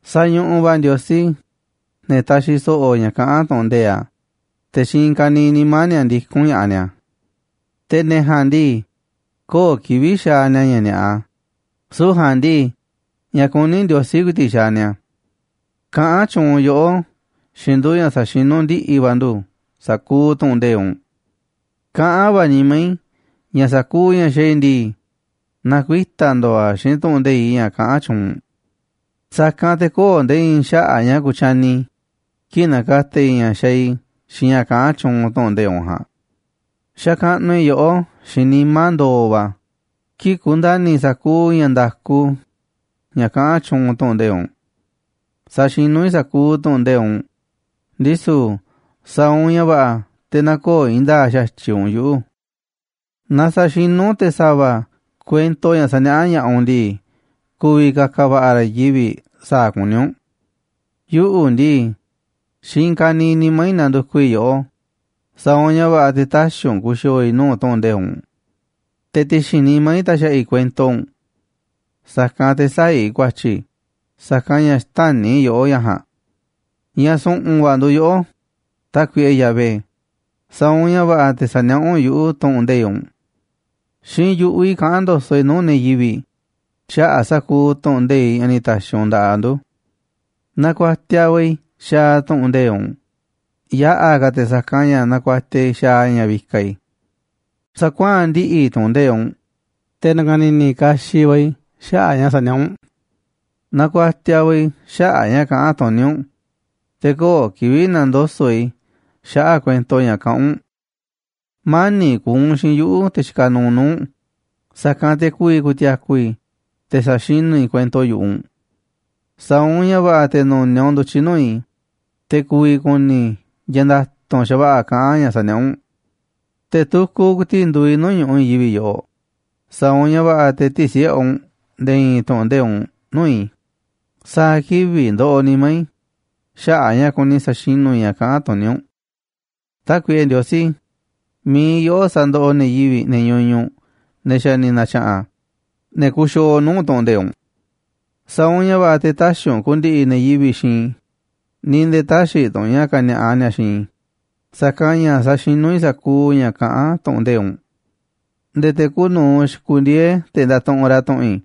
Sañuꞌuꞌ va̱ Ndiosí ne̱ taxiꞌ so̱ꞌo̱ ña̱ kaꞌán tu̱ꞌu̱n nde̱iꞌ a̱, te̱ xiinꞌ i̱i̱n ka̱niiꞌ nimá ni̱a̱ ndikún ña̱ꞌaꞌ ni̱a̱. Te̱ ne̱ ja̱a̱nꞌ ndii, köo̱ꞌ kivi̱ꞌ xaaꞌ ni̱a̱ ña̱ ni̱a̱ꞌa, süu̱ꞌ ja̱a̱nꞌ ndii, ña̱ kuní Ndiosí ku̱i̱ti̱ꞌ xaaꞌ ni̱a̱. Kaꞌán tyuunꞌ yoꞌó xiinꞌ ndu̱ ña̱ sa̱xinú ndiꞌi̱ va̱ ndu̱ sa̱kuuꞌ tu̱ꞌu̱n nde̱iꞌ u̱nꞌ. Kaꞌán va̱ nimá i̱ ña̱ sa̱kuuꞌ ña̱ xaaꞌ i̱ ndii, na̱kuita̱ ndo̱o̱ a̱ xiinꞌ tu̱ꞌu̱n nde̱iꞌ ña̱ kaꞌán tyuunꞌ u̱nꞌ. Sa̱kanꞌ te̱ köo̱ꞌ nde̱e̱ i̱i̱n xaꞌa̱ꞌ ña̱ ku̱tyani i̱, kii̱ꞌ na̱ka̱ta̱ i̱ ña̱ xaaꞌ i̱ xiinꞌ ña̱ kaꞌán tyuunꞌ tu̱ꞌu̱n nde̱iꞌ u̱nꞌ ja̱a̱nꞌ. Xakaꞌnuꞌ i̱ yoꞌó xiinꞌ nimá ndo̱o̱ va̱, kii̱ꞌ ku̱nda̱ni̱ i̱ sa̱kuuꞌ ña̱ nda̱ku ña̱ kaꞌán tyuunꞌ tu̱ꞌu̱n nde̱iꞌ u̱nꞌ. Saxinú i̱ sa̱kuuꞌ tu̱ꞌu̱n nde̱iꞌ u̱nꞌ, ndisu̱ sa̱a̱ u̱nꞌ ña̱ va̱ꞌa̱ te̱ nä̱ko̱o̱ i̱i̱n nda̱a̱ꞌ xa̱tyiꞌ u̱nꞌ yuꞌu̱. Naaꞌ sa̱xinú te̱ sa̱va̱ kuento ña̱ saniaꞌá ña̱ꞌaꞌ u̱nꞌ ndii, ku̱vi̱ ka̱ka̱ va̱ꞌa̱ ra̱ i̱i̱n yivi̱ꞌ sa̱a̱ kuní u̱nꞌ. Yuꞌu̱ ndii, xiinꞌ i̱i̱n ka̱niiꞌ nimá i̱ nandukuꞌ i̱ yoꞌó, sa̱a̱ u̱nꞌ ña̱ va̱ꞌa̱ te̱ tä̱xi̱ u̱nꞌ ku̱xi̱o̱o̱ i̱ nuu̱ꞌ tu̱ꞌu̱n nde̱iꞌ u̱nꞌ. Te̱ ti̱xi̱n nimá i̱ taxaꞌa i̱ kuento u̱nꞌ, sa̱kanꞌ te̱ sä̱a̱ i̱ ku̱a̱tyi̱, sa̱kanꞌ ña̱ xtäni̱ yoꞌó ña̱ ja̱a̱nꞌ. Ña̱ su̱ꞌu̱n va̱ nduuꞌ yoꞌó, Tákuiꞌe Yahvé, sa̱a̱ u̱nꞌ ña̱ va̱ꞌa̱ te̱ sa̱niaꞌá u̱nꞌ yuꞌu̱ tu̱ꞌu̱n nde̱iꞌ u̱nꞌ. Xiinꞌ yu̱ꞌuꞌ i̱ kaꞌán ndo̱so̱ꞌ i̱ nuu̱ꞌ ne̱ yivi̱ꞌ xaꞌa̱ꞌ sa̱kuuꞌ tu̱ꞌu̱n nde̱iꞌ ña̱ ni̱ ta̱xi̱ u̱nꞌ nda̱ꞌaꞌ ndu̱. Nakuatiaꞌ va̱ i̱ xaaꞌ tu̱ꞌu̱n nde̱iꞌ u̱nꞌ, yaꞌa̱ ka̱ te̱ sa̱kanꞌ ña̱ nakuatiaꞌ i̱ xaaꞌ ña̱ vikaꞌ i̱. Sa̱kuaa̱n ndiꞌi̱ i̱ tu̱ꞌu̱n nde̱iꞌ u̱nꞌ, te̱ na̱ka̱ni̱ni̱ kaxiꞌ va̱ i̱ xaꞌa̱ꞌ ña̱ saniaꞌá u̱nꞌ. Nakuatiaꞌ va̱ i̱ xaꞌa̱ꞌ ña̱ kaꞌán tuní u̱nꞌ, te̱ köo̱ꞌ kivi̱ꞌ na̱ndoso̱ꞌ i̱ xaꞌa̱ꞌ kuento ña̱ kaꞌán u̱nꞌ. Mani̱ꞌ ku̱u̱ u̱nꞌ xiinꞌ yuꞌu̱, te̱ xikaꞌ nuuꞌ nuu̱ꞌ u̱nꞌ, sa̱kanꞌ te̱ ku̱vi̱ ku̱ti̱a̱ku̱ i̱ te̱ sa̱xinú i̱ kuento yu̱ꞌuꞌ u̱nꞌ. Sa̱a̱ u̱nꞌ ña̱ va̱ꞌa̱ te̱ nu̱niaꞌ u̱nꞌ ndu̱tyiꞌ nuu̱ꞌ i̱, te̱ ku̱vi̱ ku̱ni̱ i̱ ña̱ nda̱tu̱nꞌ xa̱va̱ꞌa̱ kaꞌán ña̱ saniaꞌá u̱nꞌ. Te̱ tukuꞌ ku̱i̱ti̱ꞌ nduuꞌ i̱ nuu̱ꞌ ñu̱ꞌuꞌ i̱i̱n yivi̱ꞌ yoꞌoꞌ, sa̱a̱ u̱nꞌ ña̱ va̱ꞌa̱ te̱ tï̱si̱ꞌe u̱nꞌ nde̱e̱ i̱i̱n tu̱ꞌu̱n nde̱iꞌ u̱nꞌ nuu̱ꞌ i̱. Sa̱a̱ kivi̱ꞌ ndoꞌoꞌ nimá i̱ xaꞌa̱ꞌ a̱ ña̱ kuni sa̱xinú i̱ ña̱ kaꞌán tuní u̱nꞌ. Tákuiꞌe Ndiosí, mi̱iꞌ yoꞌó sandoꞌoꞌ ne̱ yivi̱ꞌ, ne̱ ñuñuꞌ, ne̱ xa̱ ni̱ na̱tya̱ꞌa̱n, ne̱ kuxiooꞌ nuu̱ꞌ tu̱ꞌu̱n nde̱iꞌ u̱nꞌ. Sa̱a̱ u̱nꞌ ña̱ va̱ꞌa̱ te̱ tä̱xi̱ u̱nꞌ ku̱ndi̱ꞌi̱ ne̱ yivi̱ꞌ xiinꞌ i̱, ni̱ nde̱e̱ tä̱xi̱ tu̱ u̱nꞌ ña̱ ka̱ni̱a̱ꞌa ni̱a̱ xiinꞌ i̱, sa̱kanꞌ ña̱ saxinú i̱ sa̱kuuꞌ ña̱ kaꞌán tu̱ꞌu̱n nde̱iꞌ u̱nꞌ. Nde̱e̱ te̱ kuuꞌ nu̱uꞌ xikundieé te̱ ndatuꞌunꞌ ra̱ tu̱ꞌu̱n i̱,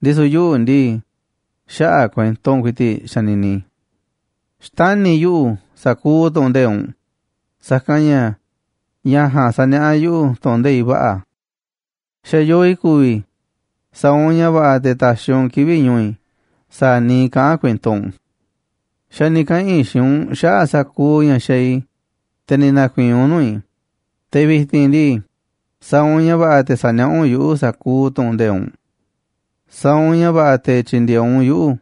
ndisu̱ yuꞌu̱ ndii, xaꞌa̱ꞌ kuento u̱nꞌ ku̱i̱ti̱ꞌ xanini i̱. Xtani̱ yuꞌu̱ sa̱kuuꞌ tu̱ꞌu̱n nde̱iꞌ u̱nꞌ, sa̱kanꞌ ña̱ ña̱ ja̱a̱nꞌ saniaꞌá yuꞌu̱ tu̱ꞌu̱n nde̱iꞌ va̱ꞌa̱. Xa̱ yoo i̱ ku̱vi̱ i̱, sa̱a̱ u̱nꞌ ña̱ va̱ꞌa̱ te̱ ta̱xi̱ u̱nꞌ kivi̱ꞌ ñu̱u̱ i̱ sa̱a̱ niiꞌ kaꞌán kuento u̱nꞌ. Xa̱ ni̱ kaꞌa̱n i̱ xiinꞌ u̱nꞌ xaꞌa̱ꞌ sa̱kuuꞌ ña̱ xaaꞌ i̱, te̱ ni̱ na̱ku̱i̱i̱n u̱nꞌ nuu̱ꞌ i̱, te̱ vi̱ti̱n ndii, sa̱a̱ u̱nꞌ ña̱ va̱ꞌa̱ te̱ sa̱niaꞌá u̱nꞌ yuꞌu̱ sa̱kuuꞌ tu̱ꞌu̱n nde̱iꞌ u̱nꞌ. Sa̱a̱ u̱nꞌ ña̱ va̱ꞌa̱ te̱ tyi̱ndi̱e̱eꞌ u̱nꞌ yuꞌu̱,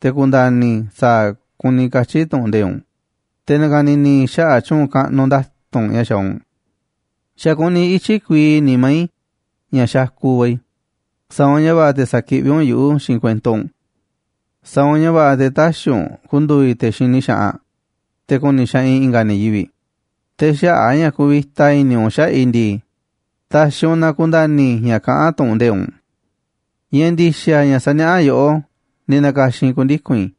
te̱ ku̱nda̱ni̱ i̱ sa̱a̱ kuni katyi̱ tu̱ꞌu̱n nde̱iꞌ u̱nꞌ, te̱ na̱ka̱ni̱ni̱ i̱ xaꞌa̱ꞌ tyu̱u̱n kaꞌnuꞌ nda̱tu̱nꞌ ña̱ xaaꞌ u̱nꞌ. Xa̱ kuni ityi̱ kuii nimá i̱ ña̱ xakuꞌ va̱ i̱, sa̱a̱ u̱nꞌ ña̱ va̱ꞌa̱ te̱ sa̱kiꞌví u̱nꞌ yuꞌu̱ xiinꞌ kuento u̱nꞌ. Sa̱a̱ u̱nꞌ ña̱ va̱ꞌa̱ te̱ tä̱xi̱ u̱nꞌ ku̱ndu̱u̱ i̱ te̱ xini xaꞌanꞌ te̱ ku̱ni̱ xaꞌanꞌ i̱ i̱nga̱ ne̱ yivi̱ꞌ, te̱ xaꞌa̱ꞌ a̱ ña̱ kuvita i̱ni̱ u̱nꞌ xaꞌa̱ꞌ i̱ ndii, ta̱xi̱ u̱nꞌ na ku̱nda̱ni̱ i̱ ña̱ kaꞌán tu̱ꞌu̱n nde̱iꞌ u̱nꞌ. Ña̱ ndi̱xa̱ ña̱ saniaꞌá yoꞌó, ni̱ na̱ka̱xi̱n i̱ ku̱ndiku̱n i̱,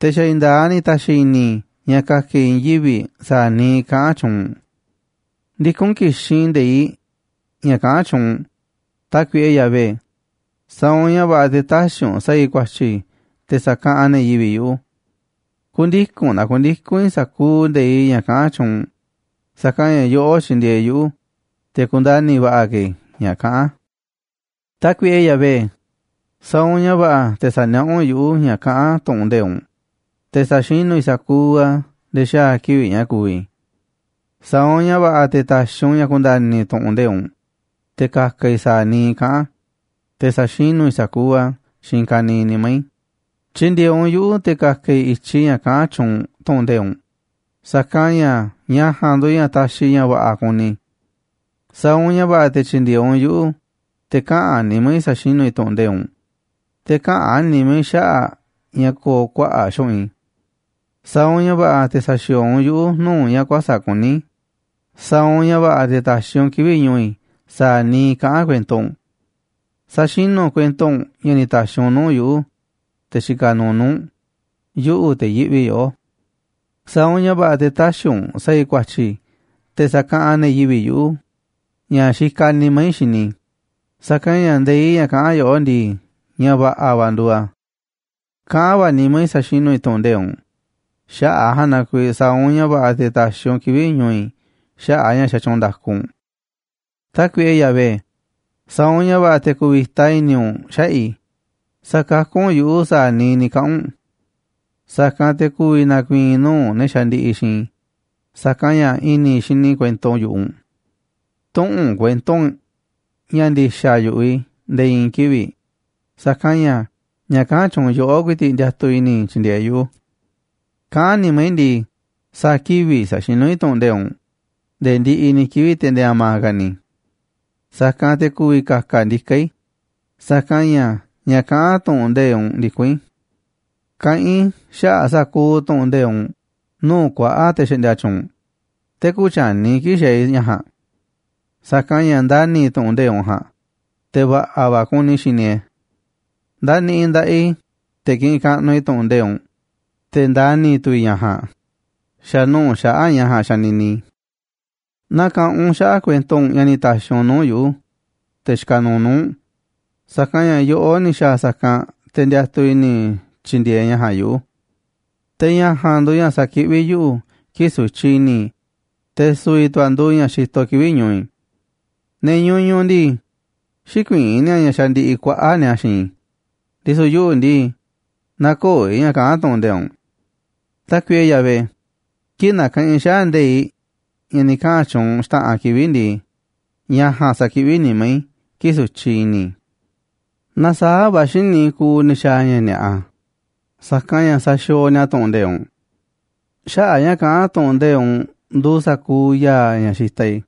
te̱ xa̱ i̱i̱n nda̱a̱ꞌ a̱ ni̱ ta̱xi̱ i̱ni̱ i̱ ña̱ ka̱ka̱ i̱ i̱i̱n yivi̱ꞌ sa̱a̱ niiꞌ kaꞌán tyuunꞌ u̱nꞌ. Ndikún ki̱xinꞌ i̱ nde̱iꞌ ña̱ kaꞌán tyuunꞌ u̱nꞌ, Tákuiꞌe Yahvé, sa̱a̱ u̱nꞌ ña̱ va̱ꞌa̱ te̱ tä̱xi̱ u̱nꞌ sa̱a̱ i̱ ku̱a̱tyi̱ te̱ sa̱kaꞌanꞌ ne̱ yivi̱ꞌ yuꞌu̱. Ku̱ndiku̱n na ku̱ndiku̱n i̱ sa̱kuuꞌ nde̱iꞌ ña̱ kaꞌán tyuunꞌ u̱nꞌ, sa̱kanꞌ ña̱ yoꞌó tyindieeꞌ yuꞌu̱ te̱ kundani̱ va̱ꞌa̱ ka̱ i̱ ña̱ kaꞌán a̱. Tákuiꞌe Yahvé, sa̱a̱ u̱nꞌ ña̱ va̱ꞌa̱ te̱ sa̱niaꞌá u̱nꞌ yuꞌu̱ ña̱ kaꞌán tu̱ꞌu̱n nde̱iꞌ u̱nꞌ, te̱ sa̱xinú i̱ sa̱kuuꞌ a̱ nde̱e̱ xaa̱ kivi̱ꞌ ña̱ ku̱vi̱ i̱. Sa̱a̱ u̱nꞌ ña̱ va̱ꞌa̱ te̱ ta̱xi̱ u̱nꞌ ña̱ ku̱nda̱ni̱ i̱ tu̱ꞌu̱n nde̱iꞌ u̱nꞌ, te̱ ka̱ka̱ i̱ sa̱a̱ niiꞌ kaꞌán a̱, te̱ sa̱xinú i̱ sa̱kuuꞌ a̱ xiinꞌ i̱i̱n ka̱niiꞌ nimá i̱. Tyi̱ndi̱e̱eꞌ u̱nꞌ yuꞌu̱ te̱ ka̱ka̱ i̱ i̱tyiꞌ ña̱ kaꞌán tyuunꞌ tu̱ꞌu̱n nde̱iꞌ u̱nꞌ, sa̱kanꞌ ña̱ ña̱ ja̱a̱nꞌ nduuꞌ ña̱ taxiꞌ ña̱ va̱ꞌa̱ kuni i̱. Sa̱a̱ u̱nꞌ ña̱ va̱ꞌa̱ te̱ tyi̱ndi̱e̱eꞌ u̱nꞌ yuꞌu̱ te̱ kaꞌa̱n nimá i̱ sa̱xinú i̱ tu̱ꞌu̱n nde̱iꞌ u̱nꞌ, te̱ käꞌa̱n nimá i̱ xaꞌa̱ꞌ ña̱ ko̱o̱ kuaꞌa̱ꞌ xu̱ꞌunꞌ i̱. Sa̱a̱ u̱nꞌ ña̱ va̱ꞌa̱ te̱ sa̱xi̱o̱o̱ u̱nꞌ yuꞌu̱ nuu̱ꞌ ña̱ kuäsa̱ꞌ kuní, sa̱a̱ u̱nꞌ ña̱ va̱ꞌa̱ te̱ ta̱xi̱ u̱nꞌ kivi̱ꞌ ñu̱u̱ i̱ sa̱a̱ niiꞌ kaꞌán kuento u̱nꞌ. Sa̱xinú u̱nꞌ kuento u̱nꞌ ña̱ ni̱ ta̱xi̱ u̱nꞌ nuu̱ꞌ yuꞌu̱, te̱ xikaꞌ nuuꞌ nuu̱ꞌ u̱nꞌ, yuꞌu̱, te̱ yiꞌvi yoꞌó. Sa̱a̱ u̱nꞌ ña̱ va̱ꞌa̱ te̱ tä̱xi̱ u̱nꞌ sa̱a̱ i̱ ku̱a̱tyi̱ te̱ sa̱kaꞌanꞌ ne̱ yivi̱ꞌ yuꞌu̱ ña̱ xikaꞌ nimá i̱ xini i̱, sa̱kanꞌ ña̱ nde̱iꞌ ña̱ kaꞌán yoꞌó ndii, ña̱ va̱ꞌa̱ va̱ nduuꞌ a̱. Kaꞌán va̱ nimá i̱ sa̱xinú i̱ tu̱ꞌu̱n nde̱iꞌ u̱nꞌ, xaꞌa̱ꞌ a̱ ja̱a̱nꞌ na kuiiꞌ sa̱a̱ u̱nꞌ ña̱ va̱ꞌa̱ te̱ ta̱xi̱ u̱nꞌ kivi̱ꞌ ñu̱u̱ i̱ xaꞌa̱ꞌ a̱ ña̱ xatyuunꞌ nda̱ku u̱nꞌ. Tákuiꞌe Yahvé, sa̱a̱ u̱nꞌ ña̱ va̱ꞌa̱ te̱ ku̱vi̱ta i̱ni̱ u̱nꞌ xaꞌa̱ꞌ i̱, sa̱kakú u̱nꞌ yuꞌu̱ sa̱a̱ niiꞌ ni̱ kaꞌa̱n u̱nꞌ. Sa̱kanꞌ te̱ ku̱vi̱ na̱ku̱i̱i̱n i̱ nuu̱ꞌ ne̱ xandiꞌiꞌ xiinꞌ i̱, sa̱kanꞌ ña̱ i̱ni̱ xini i̱ kuento yu̱ꞌuꞌ u̱nꞌ. Tü̱ꞌu̱n u̱nꞌ kuento u̱nꞌ ña̱ ndi̱xa̱ yu̱ꞌuꞌ i̱ nde̱e̱ i̱i̱n kivi̱ꞌ, sa̱kanꞌ ña̱ ña̱ kaꞌán tyuunꞌ yoꞌó ku̱i̱ti̱ꞌ ndiatuꞌ i̱ni̱ i̱ tyi̱ndi̱e̱eꞌ yuꞌu̱. Kaꞌán nimá i̱ ndii, sa̱a̱ kivi̱ꞌ sa̱xinú i̱ tu̱ꞌu̱n nde̱iꞌ u̱nꞌ, nde̱e̱ ndiꞌiꞌ ni̱ kivi̱ꞌ, te̱ nde̱e̱ a̱ma̱ ka̱ ni̱. Sa̱kanꞌ te̱ ku̱vi̱ ka̱ka̱ ndiká i̱, sa̱kanꞌ ña̱ ña̱ kaꞌán tu̱ꞌu̱n nde̱iꞌ u̱nꞌ ndikún i̱. Kaꞌán i̱ xaꞌa̱ꞌ sa̱kuuꞌ tu̱ꞌu̱n nde̱iꞌ u̱nꞌ nuu̱ꞌ kuaꞌa̱ꞌ te̱ xaꞌndia tyuunꞌ, te̱ kütyani i̱ kii̱ꞌ xaaꞌ i̱ ña̱ ja̱a̱nꞌ. Sa̱kanꞌ ña̱ ndani̱ i̱ tu̱ꞌu̱n nde̱iꞌ u̱nꞌ ja̱a̱nꞌ, te̱ va̱ꞌa̱ va̱ kuni i̱ xini e̱ꞌ e̱. Ndaniꞌiꞌ i̱ nda̱ꞌaꞌ i̱ te̱ kiꞌinꞌ kaꞌnuꞌ i̱ tu̱ꞌu̱n nde̱iꞌ u̱nꞌ, te̱ ndani̱ tu̱ i̱ ña̱ ja̱a̱nꞌ, xa̱ nuu̱ꞌ xaꞌa̱ꞌ ña̱ ja̱a̱nꞌ xanini i̱. Na̱ka̱ꞌanꞌ u̱nꞌ xaꞌa̱ꞌ kuento ña̱ ni̱ ta̱xi̱ u̱nꞌ nuu̱ꞌ yuꞌu̱, te̱ xikaꞌ nuuꞌ nuu̱ꞌ u̱nꞌ, sa̱kanꞌ ña̱ yoꞌó ni̱ xa̱a̱ sa̱kanꞌ, te̱ ndiatuꞌ i̱ni̱ i̱ tyi̱ndi̱e̱eꞌ ña̱ ja̱a̱nꞌ yuꞌu̱. Te̱ ña̱ ja̱a̱nꞌ nduuꞌ ña̱ sakiꞌví yuꞌu̱ kii̱ꞌ sutyiꞌ i̱ni̱ i̱, te̱ su̱vi̱ tu̱ a̱ nduuꞌ ña̱ xitoꞌ kivi̱ꞌ ñu̱u̱ i̱. Ne̱ ñuñuꞌ ndii, xïkuiín ni̱a̱ ña̱ xandiꞌiꞌ kuaꞌa̱ꞌ ni̱a̱ xiinꞌ i̱, ndisu̱ yuꞌu̱ ndii, nä̱ko̱o̱ i̱ ña̱ kaꞌán tu̱ꞌu̱n nde̱iꞌ u̱nꞌ. Tákuiꞌe Yahvé, kii̱ꞌ nakaꞌanꞌ i̱ xaꞌa̱ꞌ nde̱iꞌ ña̱ ni̱ kaꞌa̱n tyuunꞌ u̱nꞌ xta̱ꞌanꞌ kivi̱ꞌ ndii, ña̱ ja̱a̱nꞌ sakiꞌví nimá i̱ kii̱ꞌ sutyiꞌ i̱ni̱ i̱. Nasaáꞌ va̱ xíniꞌ i̱ kuuꞌ ne̱ xaaꞌ ña̱ ni̱a̱ꞌa, sa̱kanꞌ ña̱ saxiooꞌ ni̱a̱ tu̱ꞌu̱n nde̱iꞌ u̱nꞌ. Xaꞌa̱ꞌ ña̱ kaꞌán tu̱ꞌu̱n nde̱iꞌ u̱nꞌ nduuꞌ sa̱kuuꞌ ya̱a̱ ña̱ xitaꞌ i̱,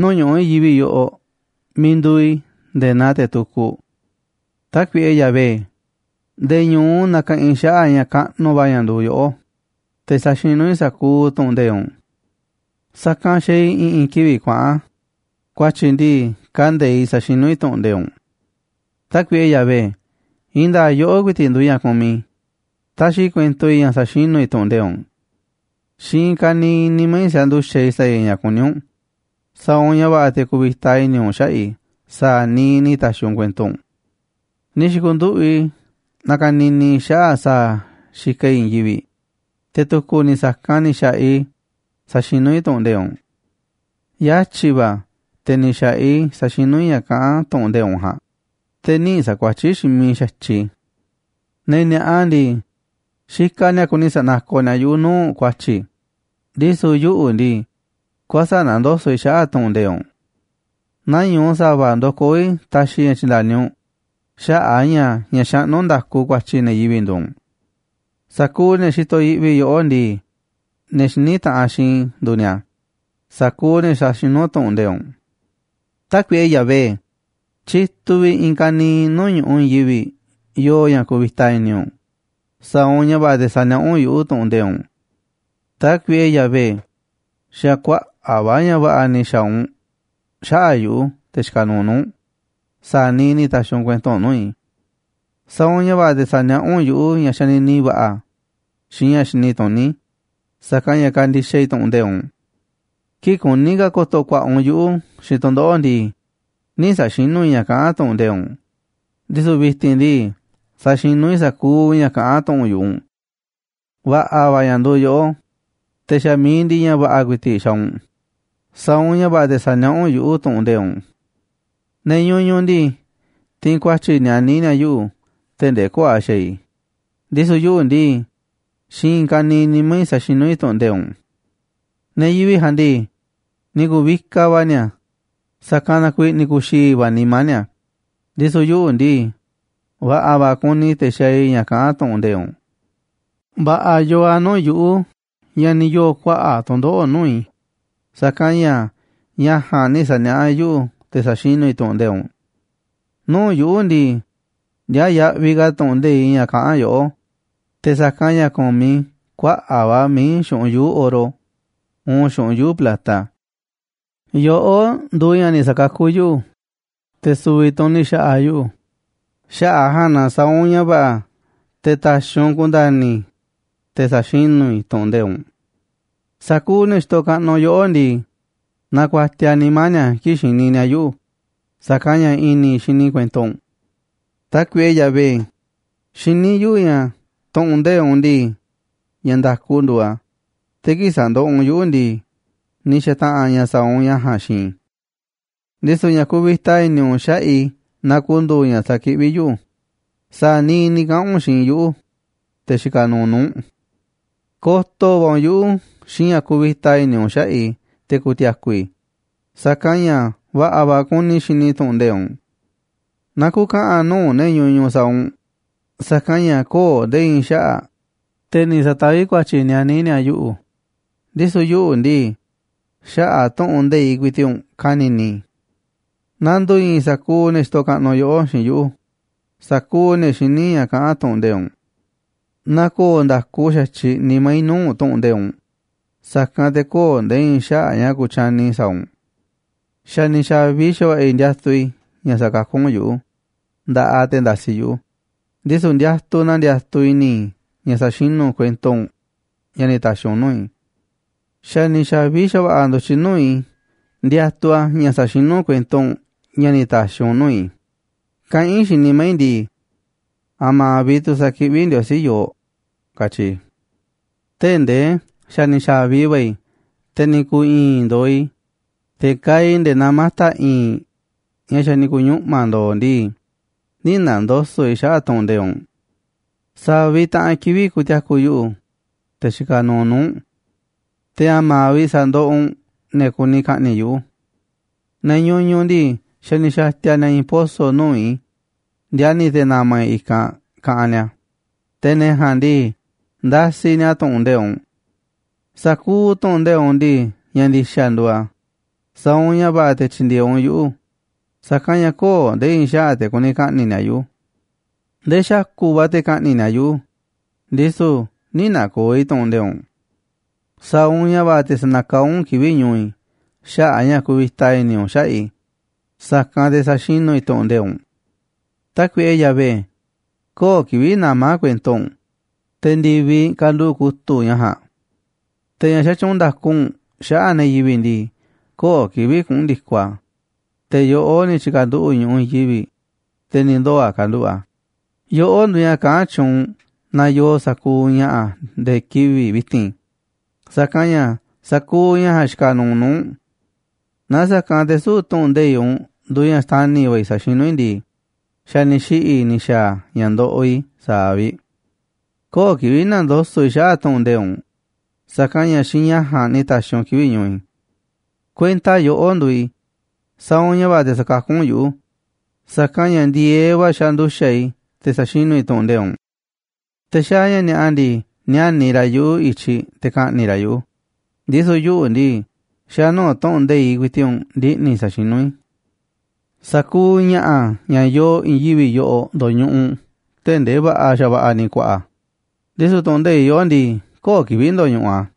nuu̱ꞌ ñu̱ꞌuꞌ i̱i̱n yivi̱ꞌ yoꞌoꞌ miiꞌ nduuꞌ i̱ nde̱e̱ naa te̱ tukuꞌ. Tákuiꞌe Yahvé, nde̱e̱ ñu̱u nakaꞌanꞌ i̱ xaꞌa̱ꞌ ña̱ kaꞌnuꞌ va̱ ña̱ nduuꞌ yoꞌó, te̱ saxinú i̱ sa̱kuuꞌ tu̱ꞌu̱n nde̱iꞌ u̱nꞌ. Sa̱kanꞌ xaaꞌ i̱ i̱ꞌi̱n kivi̱ꞌ kuaꞌa̱n, ku̱a̱tyi̱ ndii, kande̱iꞌ saxinú i̱ tu̱ꞌu̱n nde̱iꞌ u̱nꞌ. Tákuiꞌe Yahvé, i̱i̱n nda̱a̱ꞌ yoꞌó ku̱i̱ti̱ꞌ nduuꞌ ña̱ kumiꞌ i̱, taxiꞌ i̱ kuento i̱ ña̱ saxinú i̱ tu̱ꞌu̱n nde̱iꞌ u̱nꞌ. Xiinꞌ i̱i̱n ka̱niiꞌ nimá i̱ sanduxa̱ꞌ i̱ sa̱a̱ i̱ ña̱ kuní u̱nꞌ, sa̱a̱ u̱nꞌ ña̱ va̱ꞌa̱ te̱ ku̱vi̱ta i̱ni̱ u̱nꞌ xaꞌa̱ꞌ i̱ sa̱a̱ niiꞌ ni̱ ta̱xi̱ u̱nꞌ kuento u̱nꞌ. Ni̱ xi̱ku̱nduꞌu̱ꞌ i̱ nakanini i̱ xaꞌa̱ꞌ sa̱a̱ xikaꞌ i̱ i̱i̱n yivi̱ꞌ, te̱ tu̱ku̱ ni̱ sa̱kanꞌ ni̱ xa̱ꞌaꞌ i̱ saxinú i̱ tu̱ꞌu̱n nde̱iꞌ u̱nꞌ. Yatyi̱ va̱ te̱ ni̱ xa̱ꞌaꞌ i̱ saxinú i̱ ña̱ kaꞌán tu̱ꞌu̱n nde̱iꞌ u̱nꞌ ja̱a̱nꞌ, te̱ nï̱ sa̱kuatyí xiinꞌ miiꞌ xa̱tyiꞌ i̱. Ne̱ ni̱a̱ꞌa ndii, xikaꞌ ni̱a̱ kuni sa̱nakoꞌ ni̱a̱ yuꞌu̱ nuu̱ꞌ ku̱a̱tyi̱, ndisu̱ yuꞌu̱ ndii, kuäsa̱ꞌ nandoso̱ꞌ i̱ xaꞌa̱ꞌ tu̱ꞌu̱n nde̱iꞌ u̱nꞌ. Nañu̱u sa̱va̱ ndokoó i̱, taxiꞌ i̱ ña̱ tyi̱nda̱ni u̱nꞌ, xaꞌa̱ꞌ a̱ ña̱ ña̱ xaꞌnú nda̱ku ku̱a̱tyi̱ ne̱ yivi̱ꞌ nduuꞌ u̱nꞌ. Sa̱kuuꞌ ne̱ xitoꞌ yiꞌvi yoꞌó ndii, ne̱ xiní taꞌanꞌ xiinꞌ i̱ nduuꞌ ni̱a̱, sa̱kuuꞌ ne̱ saxinú tu̱ꞌu̱n nde̱iꞌ u̱nꞌ. Tákuiꞌe Yahvé, tyituꞌ vi̱ꞌ i̱i̱n ka̱niiꞌ nuu̱ꞌ ñu̱ꞌuꞌ i̱i̱n yivi̱ꞌ yoo ña̱ kuvita i̱ni̱ u̱nꞌ, sa̱a̱ u̱nꞌ ña̱ va̱ꞌa̱ te̱ sa̱niaꞌá u̱nꞌ yuꞌu̱ tu̱ꞌu̱n nde̱iꞌ u̱nꞌ. Tákuiꞌe Yahvé, xa̱ kuaꞌa̱ꞌ va̱ ña̱ va̱ꞌa̱ ni̱ xa̱a̱ u̱nꞌ xaꞌa̱ꞌ yuꞌu̱, te̱ xikaꞌ nuuꞌ nuu̱ꞌ u̱nꞌ, sa̱a̱ niiꞌ ni̱ ta̱xi̱ u̱nꞌ kuento nuu̱ꞌ i̱. Sa̱a̱ u̱nꞌ ña̱ va̱ꞌa̱ te̱ sa̱niaꞌá u̱nꞌ yuꞌu̱ ña̱ xanini va̱ꞌa̱ xiinꞌ ña̱ xini tuní, sa̱kanꞌ ña̱ kandixaꞌ i̱ tu̱ꞌu̱n nde̱iꞌ u̱nꞌ. Kii̱ꞌ kuní ka̱ ko̱to̱ ku̱a̱ꞌa̱ u̱nꞌ yuꞌu̱ xiinꞌ tu̱ndoꞌo̱ꞌ ndii, nï̱ sa̱xinú i̱ ña̱ kaꞌán tu̱ꞌu̱n nde̱iꞌ u̱nꞌ, ndisu̱ vi̱ti̱n ndii, saxinú i̱ sa̱kuuꞌ ña̱ kaꞌán tu̱ꞌu̱n yu̱ꞌuꞌ u̱nꞌ. Va̱ꞌa̱ va̱ ña̱ nduuꞌ yoꞌó, te̱ xa̱ mi̱iꞌ ndiꞌiꞌ ña̱ va̱ꞌa̱ ku̱i̱ti̱ꞌ xaaꞌ u̱nꞌ, sa̱a̱ u̱nꞌ ña̱ va̱ꞌa̱ te̱ sa̱niaꞌá u̱nꞌ yuꞌu̱ tu̱ꞌu̱n nde̱iꞌ u̱nꞌ. Ne̱ ñuñuꞌ ndii, tiinꞌ ku̱a̱tyi̱ nianí ni̱a̱ yuꞌu̱ tee̱ꞌ ndee köo̱ꞌ a̱ xaaꞌ i̱, ndisu̱ yuꞌu̱ ndii, xiinꞌ i̱i̱n ka̱niiꞌ nimá i̱ saxinú i̱ tu̱ꞌu̱n nde̱iꞌ u̱nꞌ. Ne̱ yivi̱ꞌ ja̱a̱nꞌ ndii, ni̱ ku̱vikaꞌ va̱ ni̱a̱, sa̱kanꞌ na kuiiꞌ ni̱ ku̱xi̱i̱ va̱ nimá ni̱a̱, ndisu̱ yuꞌu̱ ndii, va̱ꞌa̱ va̱ kuni i̱ te̱ xaaꞌ i̱ ña̱ kaꞌán tu̱ꞌu̱n nde̱iꞌ u̱nꞌ. Va̱ꞌa̱ yooꞌ a̱ nuu̱ꞌ yuꞌu̱ ña̱ ni̱ yoo̱ kuaꞌa̱ꞌ tu̱ndoꞌo̱ꞌ nuu̱ꞌ i̱, sa̱kanꞌ ña̱ ña̱ ja̱a̱nꞌ ni̱ sa̱niaꞌá yuꞌu̱ te̱ saxinú i̱ tu̱ꞌu̱n nde̱iꞌ u̱nꞌ. Nuu̱ꞌ yuꞌu̱ ndii, ndiaaꞌ yaꞌviꞌ ka̱ tu̱ꞌu̱n nde̱iꞌ ña̱ kaꞌán yoꞌó, te̱ sa̱kanꞌ ña̱ kumiꞌ i̱ kuaꞌa̱ꞌ va̱ mií xu̱ꞌunꞌ yuu̱ꞌ oro uun xu̱ꞌunꞌ yuu̱ꞌ plata. Yoꞌó nduuꞌ ña̱ ni̱ sa̱kakuꞌ yuꞌu̱, te̱ su̱vi̱ tu̱ u̱nꞌ ni̱ xa̱ꞌa̱ yuꞌu̱, xaꞌa̱ꞌ a̱ ja̱a̱nꞌ na sa̱a̱ u̱nꞌ ña̱ va̱ꞌa̱ te̱ ta̱xi̱ u̱nꞌ ku̱nda̱ni̱ i̱, te̱ sa̱xinú i̱ tu̱ꞌu̱n nde̱iꞌ u̱nꞌ. Sa̱kuuꞌ ne̱ xitoꞌ kaꞌnuꞌ yoꞌó ndii, nakuatiaꞌ nimá ni̱a̱ kii̱ꞌ xini ni̱a̱ yuꞌu̱, sa̱kanꞌ ña̱ i̱ni̱ i̱ xini i̱ kuento u̱nꞌ. Tákuiꞌe Yahvé, xiní yuꞌu̱ ña̱ tu̱ꞌu̱n nde̱iꞌ u̱nꞌ ndii, ña̱ nda̱ku nduuꞌ a̱, te̱ kii̱ꞌ sandoꞌoꞌ u̱nꞌ yuꞌu̱ ndii, ni̱ xa̱ta̱ꞌa̱n ña̱ sa̱a̱ u̱nꞌ ña̱ ja̱a̱nꞌ xiinꞌ i̱. Ndisu̱ ña̱ kuvita i̱ni̱ u̱nꞌ xaꞌa̱ꞌ i̱ na ku̱ndu̱u̱ ña̱ sa̱kiꞌví yuꞌu̱, sa̱a̱ niiꞌ ni̱ kaꞌa̱n u̱nꞌ xiinꞌ yuꞌu̱, te̱ xikaꞌ nuuꞌ nuu̱ꞌ u̱nꞌ. Ko̱to̱ va̱ u̱nꞌ yuꞌu̱ xiinꞌ ña̱ kuvita i̱ni̱ u̱nꞌ xaꞌa̱ꞌ i̱ te̱ ku̱ti̱a̱ku̱ i̱, sa̱kanꞌ ña̱ va̱ꞌa̱ va̱ kuni i̱ xini i̱ tu̱ꞌu̱n nde̱iꞌ u̱nꞌ. Na ku̱ka̱ꞌa̱n nuu̱ꞌ ne̱ ñuñuꞌ sa̱a̱ u̱nꞌ, sa̱kanꞌ ña̱ köo̱ꞌ nde̱e̱ i̱i̱n xaꞌa̱ꞌ, te̱ ni̱ sa̱taví ku̱a̱tyi̱ nianí ni̱a̱ yuꞌu̱, ndisu̱ yuꞌu̱ ndii, xaꞌa̱ꞌ tu̱ꞌu̱n nde̱iꞌ ku̱i̱ti̱ꞌ u̱nꞌ ka̱ni̱ni̱ i̱. Na ndu̱i̱i̱n sa̱kuuꞌ ne̱ xitoꞌ kaꞌnuꞌ yoꞌó xiinꞌ yuꞌu̱, sa̱kuuꞌ ne̱ xiní ña̱ kaꞌán tu̱ꞌu̱n nde̱iꞌ u̱nꞌ. Na ko̱o̱ nda̱ku xa̱tyiꞌ nimá i̱ nuu̱ꞌ tu̱ꞌu̱n nde̱iꞌ u̱nꞌ, sa̱kanꞌ te̱ köo̱ꞌ nde̱e̱ i̱i̱n xaꞌa̱ꞌ ña̱ ku̱tyani i̱ sa̱a̱ u̱nꞌ. Xa̱ ni̱ xa̱vi xa̱va̱ꞌa̱ i̱ ndiatuꞌ i̱ ña̱ sa̱kakú u̱nꞌ yuꞌu̱ nda̱ꞌaꞌ te̱ ndasiꞌ yuꞌu̱, ndisu̱ ndiatuꞌ na ndiatuꞌ i̱ni̱ i̱ ña̱ saxinú u̱nꞌ kuento u̱nꞌ ña̱ ni̱ ta̱xi̱ u̱nꞌ nuu̱ꞌ i̱. Xa̱ ni̱ xa̱vi xa̱va̱ꞌa̱ ndu̱tyiꞌ nuu̱ꞌ i̱ ndiatuꞌ a̱ ña̱ sa̱xinú u̱nꞌ kuento u̱nꞌ ña̱ ni̱ ta̱xi̱ u̱nꞌ nuu̱ꞌ i̱, kaꞌán i̱ xiinꞌ nimá i̱ ndii: “¿A̱ma̱ vi̱ꞌ tu̱ sa̱kiꞌví Ndiosí yooꞌ?”, katyi i̱. Tee̱ꞌ ndee xa̱ ni̱ xa̱vi va̱ i̱, te̱ ni̱ ku̱u̱ i̱i̱n ndooꞌ i̱, te̱ kaaꞌ i̱ nde̱e̱ naa mata̱ i̱i̱nꞌ ña̱ xa̱ ni̱ ku̱ñuꞌma̱ ndo̱o̱ ndii, nï̱ na̱ndoso̱ꞌ i̱ xaꞌa̱ꞌ tu̱ꞌu̱n nde̱iꞌ u̱nꞌ. ¿Sa̱a̱ vi̱ꞌ taꞌanꞌ kivi̱ꞌ ku̱ti̱a̱ku̱ yuꞌu̱, te̱ xikaꞌ nuuꞌ nuu̱ꞌ u̱nꞌ? Te̱, ¿a̱ma̱ vi̱ꞌ sandoꞌoꞌ u̱nꞌ ne̱ kuni ka̱ꞌni̱ꞌ yuꞌu̱? Ne̱ ñuñuꞌ ndii, xa̱ ni̱ xa̱ti̱a̱ ni̱a̱ i̱i̱n poso̱ nuu̱ꞌ i̱ ndiani̱ te̱ na̱ma̱ i̱ i̱kanꞌ, kaꞌanꞌ ni̱a̱, te̱ ne̱ ja̱a̱nꞌ ndii, ndasiꞌ ni̱a̱ tu̱ꞌu̱n nde̱iꞌ u̱nꞌ. Sa̱kuuꞌ tu̱ꞌu̱n nde̱iꞌ u̱nꞌ ndii, ña̱ ndi̱xa̱ nduuꞌ a̱, sa̱a̱ u̱nꞌ ña̱ va̱ꞌa̱ te̱ tyi̱ndi̱e̱eꞌ u̱nꞌ yuꞌu̱, sa̱kanꞌ ña̱ köo̱ꞌ nde̱e̱ i̱i̱n xaꞌa̱ꞌ te̱ kuni ka̱ꞌni̱ꞌ ni̱a̱ yuꞌu̱. Ndee xa̱ku̱ꞌ va̱ te̱ ka̱ꞌni̱ꞌ ni̱a̱ yuꞌu̱, ndisu̱ nï̱ na̱ko̱o̱ i̱ tu̱ꞌu̱n nde̱iꞌ u̱nꞌ. Sa̱a̱ u̱nꞌ ña̱ va̱ꞌa̱ te̱ sa̱na̱kaá u̱nꞌ kivi̱ꞌ ñu̱u̱ i̱ xaꞌa̱ꞌ a̱ ña̱ kuvita i̱ni̱ u̱nꞌ xaꞌa̱ꞌ i̱, sa̱kanꞌ te̱ sa̱xinú i̱ tu̱ꞌu̱n nde̱iꞌ u̱nꞌ. Tákuiꞌe Yahvé, köo̱ꞌ kivi̱ꞌ namá kuento u̱nꞌ, te̱ ndi̱viꞌ kanduꞌu̱ꞌ kutu̱ꞌ ña̱ ja̱a̱nꞌ. Te̱ ña̱ xatyuunꞌ nda̱ku u̱nꞌ xaꞌa̱ꞌ ne̱ yivi̱ꞌ ndii, köo̱ꞌ kivi̱ꞌ kuꞌu̱n ndi̱koꞌ a̱, te̱ yoꞌó ni̱ tyi̱ka̱nduꞌu̱ꞌ ñu̱ꞌuꞌ i̱i̱n yivi̱ꞌ, te̱ ni̱ ndoo̱ a̱ kanduꞌu̱ꞌ a̱. Yoꞌó nduuꞌ ña̱ kaꞌán tyuunꞌ na yooꞌ sa̱kuuꞌ ña̱ꞌa̱ nde̱e̱ kivi̱ꞌ vi̱ti̱n, sa̱kanꞌ ña̱ sa̱kuuꞌ ña̱ ja̱a̱nꞌ xikaꞌ nuuꞌ nuu̱ꞌ u̱nꞌ. Naaꞌ sa̱kanꞌ te̱ süu̱ꞌ tu̱ꞌu̱n nde̱iꞌ u̱nꞌ nduuꞌ ña̱ xtani̱ va̱ i̱ sa̱xinú i̱ ndii, xa̱ ni̱ xiꞌi̱ i̱ ni̱ xa̱a̱ ña̱ ndoꞌoꞌ i̱ sa̱aꞌ vi̱ꞌ. Köo̱ꞌ kivi̱ꞌ na̱ndoso̱ꞌ i̱ xaꞌa̱ꞌ tu̱ꞌu̱n nde̱iꞌ u̱nꞌ, sa̱kanꞌ ña̱ xiinꞌ ña̱ ja̱a̱nꞌ ni̱ ta̱xi̱ u̱nꞌ kivi̱ꞌ ñu̱u̱ i̱. Kuenta yoꞌó nduuꞌ i̱, sa̱a̱ u̱nꞌ ña̱ va̱ꞌa̱ te̱ sa̱kakú u̱nꞌ yuꞌu̱, sa̱kanꞌ ña̱ ndi̱e̱eꞌ va̱ xanduxa̱ꞌ i̱ te̱ saxinú i̱ tu̱ꞌu̱n nde̱iꞌ u̱nꞌ. Te̱ xaaꞌ ña̱ ni̱a̱ꞌa ndii, níániꞌ ra̱ yuꞌu̱ i̱tyiꞌ te̱ ka̱ꞌni̱ꞌ ra̱ yuꞌu̱, ndisu̱ yuꞌu̱ ndii, xa̱ nuu̱ꞌ tu̱ꞌu̱n nde̱iꞌ ku̱i̱ti̱ꞌ u̱nꞌ ndiꞌni̱ i̱ sa̱xinú i̱. Sa̱kuuꞌ ña̱ꞌa̱ ña̱ yoo i̱i̱n yivi̱ꞌ yoꞌoꞌ ndoñuꞌuꞌ tee̱ꞌ ndee va̱ꞌa̱ xa̱va̱ꞌa̱ ni̱ kuaꞌa̱ꞌ a̱, ndisu̱ tu̱ꞌu̱n nde̱iꞌ yoꞌó ndii, köo̱ꞌ kivi̱ꞌ ndoñuꞌuꞌ a̱.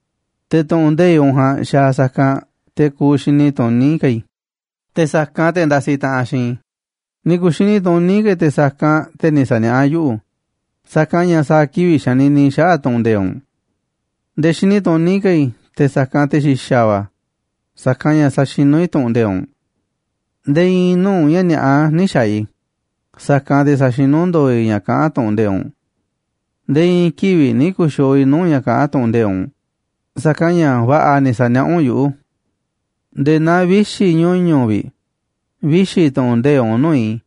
Te̱ tu̱ꞌu̱n nde̱iꞌ u̱nꞌ ja̱a̱nꞌ xaaꞌ sa̱kanꞌ te̱ kuuꞌ xini tuní ka̱ i̱, te̱ sa̱kanꞌ te̱ ndasiꞌ taꞌanꞌ xiinꞌ i̱. Ni̱ ku̱xini tuní ka̱ i̱ te̱ sa̱kanꞌ te̱ ni̱ sa̱niaꞌá yuꞌu̱, sa̱kanꞌ ña̱ sa̱a̱ kivi̱ꞌ xanini i̱ xaꞌa̱ꞌ tu̱ꞌu̱n nde̱iꞌ u̱nꞌ. Nde̱e̱ xini tuní ka̱ i̱ te̱ sa̱kanꞌ te̱ xi̱xa̱ va̱, sa̱kanꞌ ña̱ saxinú i̱ tu̱ꞌu̱n nde̱iꞌ u̱nꞌ. Nde̱e̱ i̱i̱n nuu̱ꞌ ña̱ ni̱a̱ꞌa nï̱ xa̱a̱ i̱, sa̱kanꞌ te̱ sa̱xinú ndo̱o̱ i̱ ña̱ kaꞌán tu̱ꞌu̱n nde̱iꞌ u̱nꞌ. Nde̱e̱ i̱i̱n kivi̱ꞌ nï̱ ku̱xi̱o̱o̱ i̱ nuu̱ꞌ ña̱ kaꞌán tu̱ꞌu̱n nde̱iꞌ u̱nꞌ, sa̱kanꞌ ña̱ va̱ꞌa̱ ni̱ sa̱niaꞌá u̱nꞌ yuꞌu̱. Nde̱e̱ naa vixi̱ ñuñu̱ꞌ vi̱ꞌ, vixi̱ tu̱ꞌu̱n nde̱iꞌ u̱nꞌ nuu̱ꞌ i̱,